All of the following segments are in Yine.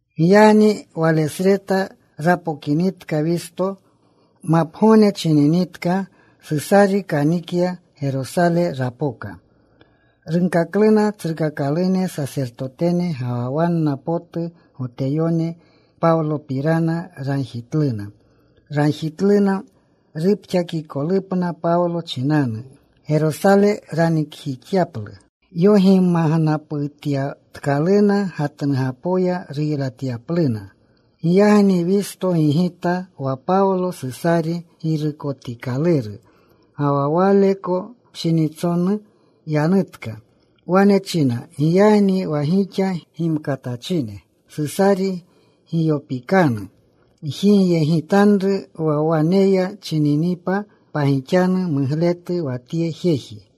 Giyagni walesreta rapokinitka Wisto. Mapgogne chininitka Susari kanikya. Gerosale rapoka. Runkakluna tsrukakalune sasertotene ga wa wanna potu Goteyone Pawlopirana. Ragjitluna. Ragjitluna rupxakikolupna Pawlo chinanu. Gerosale ranikjixyaplu. Yogimagnaputyatkaluna gatnugapoya ruylatyapluna. Giyagni Wisto gigita wa Pawlo Susari girukotikaluru, ga wa waleko pshinitsonu yanutka. Wane china, “Giyagni wa gixa gimkatachine Susari giyopikanu. Gjigyegitanru wa waneya chininipa pagixanu mugletu wa tye jeji.”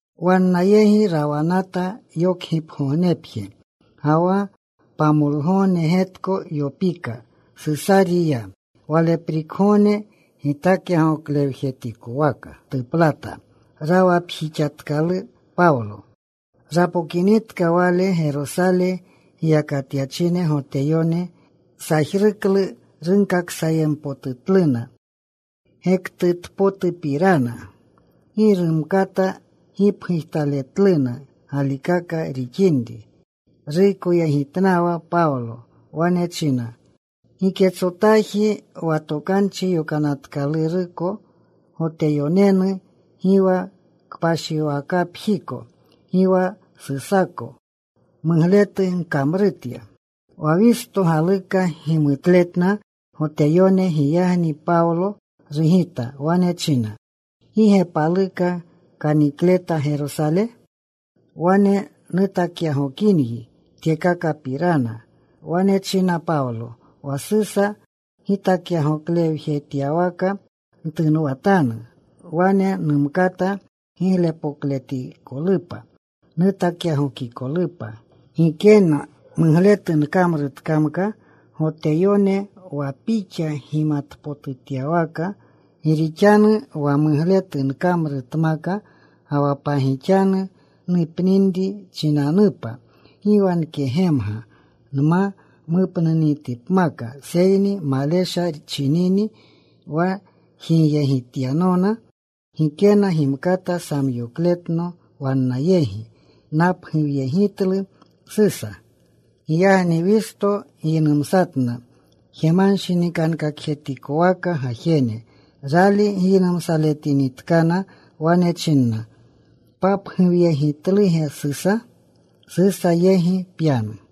Wanna yegi rawanata yokgipgognepje ga wa pamolgogne getko. Yopika. Susari ya. Waleprikgogne gitakyagoklewjetikowaka tuplata. Rawapjixatkalu Pawlo. Rapokinitka wale, Gerosale giyakatyachine Goteyone sajruklu. Runkaksayempotutluna gektutpotupirana. Gi rumkata gipgujtaletluna galikaka rixinri. Ruykoyegitnawa Pawlo. Wane china, “Giketsotaji wa Tokanchi Yokanatkaluruko Goteyonenu, gi wa kpashiwakapjiko, gi wa Susako mugletu nkamrutya.” Wa Wisto galuka gimutletna Goteyone. Giyagni Pawlo rugita. Wane china, “¿Gi ge paluka kanikleta Gerosale? Wane nutakyagokinyi tyekakapirana.” Wane china Pawlo, “Wa Susa gitakyagoklewjetyawaka ntunwatanu. Wane numkata giglepokletikolupa nutakyagokikolupa. Gikena mugletu nkamrutkamka Goteyone, wa pixa gimatpotutyawaka. Gi rixanu wa mugletu nkamrutmaka ga wa pagixanu nupninri chinanupa, gi wa nkegemga nma mupninitipmaka. Seyni malesha chinini wa jigyegityanona gikena gimkata samyokletno wannayegi. Napguwyegitlu Susa.” Giyagni Wisto giynumsatna jemanshinikankakjetikowaka gajene. Rali giynumsaletinitkana, wane china, “¿Papguwyegitluge Susa? Susa yegi pyanu.”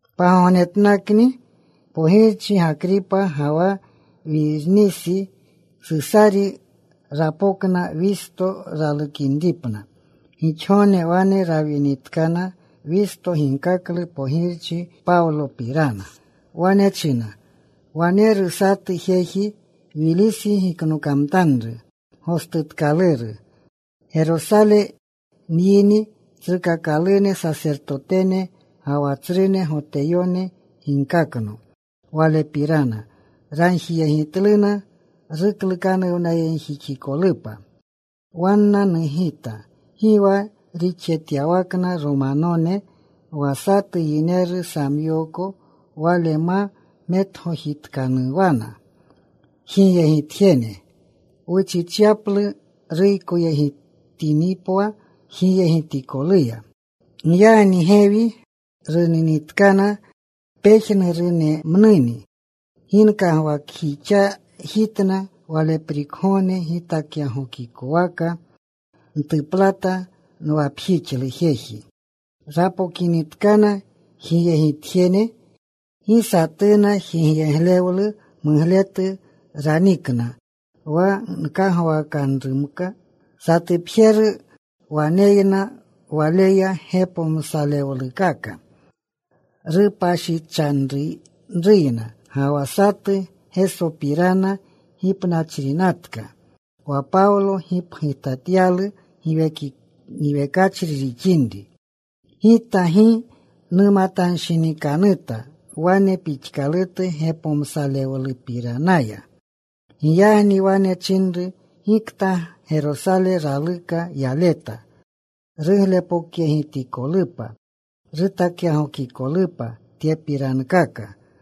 Pagognetnakni pogirchi Gakripa ga wa Wirnisa Susari rapokna. Wisto ralukinripna. Gixgogne wane rawinitkana, Wisto ginkaklu pogirchi Pawlopirana. Wane china, “Waneru satu jeji Wilisi giknokamtanru gostutkaluru. Gerosale nyini, tsrukakalune sasertotene ga wa tsrune Goteyone ginkakno walepirana. Ragjiyegitluna ruklukanuwnayegjixikolupa. “Wanna nugita, gi wa rixjetyawakna Romanone wa satu yineru samyooko wale ma metgojitkanuwana jigyegitjene wuchichyaplu ruykoyegitinipwa jigyegitikoluya. Giyagni gewi runinitkana pejnurunemnuni, gi nkagwakjixajitna. Waleprikgogne gitakyagokikowaka ntuplata. Nwapjixlu jeji. Rapokinitkana jigyegitjene gi satuna jigyeglewlu mugletu ranikna, wa nkagwakanrumka. Satupjeru waneyna waleya gepomsalewlukaka rupashichanruyna, ga wa satu Gesopirana gipnachrinatka wa Pawlo gipgujtatyalu giwekachri rixinri. Gita gi numatanshinikanuta wane pixkalutu gepomsalewlupiranaya. Giyagni wane nchinru gikta Gerosale raluka yaleta ruglepokyegitikolupa, rutakyagokikolupa tyepirankaka.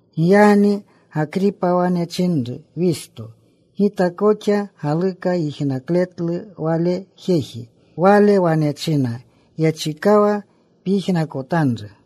Giyagni Gakripa wane chinru Wisto, “Gita koxa galuka yijnakletlu wale jeji.” Wale wane china, “Yechikawa pyijnakotanru.”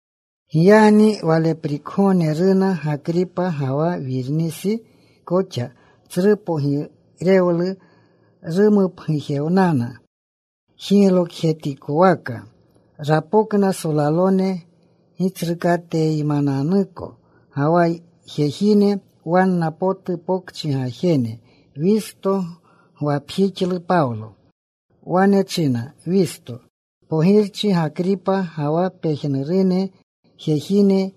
Giyagni waleprikgogne runa Gakripa ga wa Wirnisi koxa. Tsru pogirewlu rumupgujewnana. Jiglokjetikwaka rapokna, solalone gitsrukateneymananuko, ga wa jejine wanna potu pokchi gajene. Wisto gwapjixlu Pawlo. Wane china Wisto, “Pogirchi Gakripa ga wa pejnurune jejine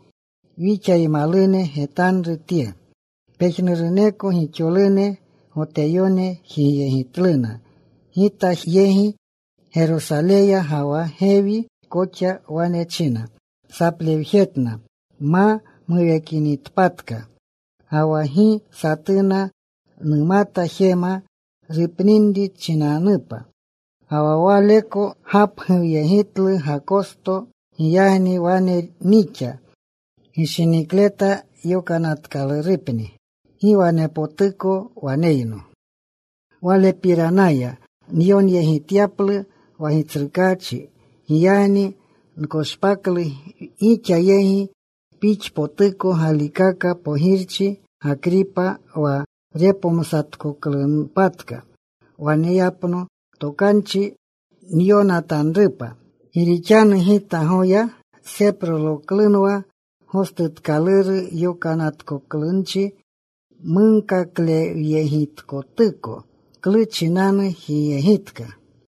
wixaymalune, getanru tye. Pejnuruneko gixolune Goteyone jigyegitluna gita yegi Gerosaleya ga wa gewi koxa. Wane china saplewjeretna ma muwekinitpatka. Ga wa gi satuna numata jema rupninri chinanupa, ga wa waleko gapguwyegitlu Gakosto. Giyagni wane nixa gishinikleta yokanatkalurupni. Gi wanepotuko waneyno walepiranaya nyonyegityaplu wa gitsrukaachi. Giyagni nkoshpaklu gixa yegi. Pixpotuko galikaka, pogirchi Gakripa, wa repomsatkoklunpatka waneyapno tokanchi nyonatanrupa. Gi rixanu gita goya seproloklunwa gostutkaluru yokanatkoklunchi munkaklewyegitkotuko klu chinanu jigyegitka.”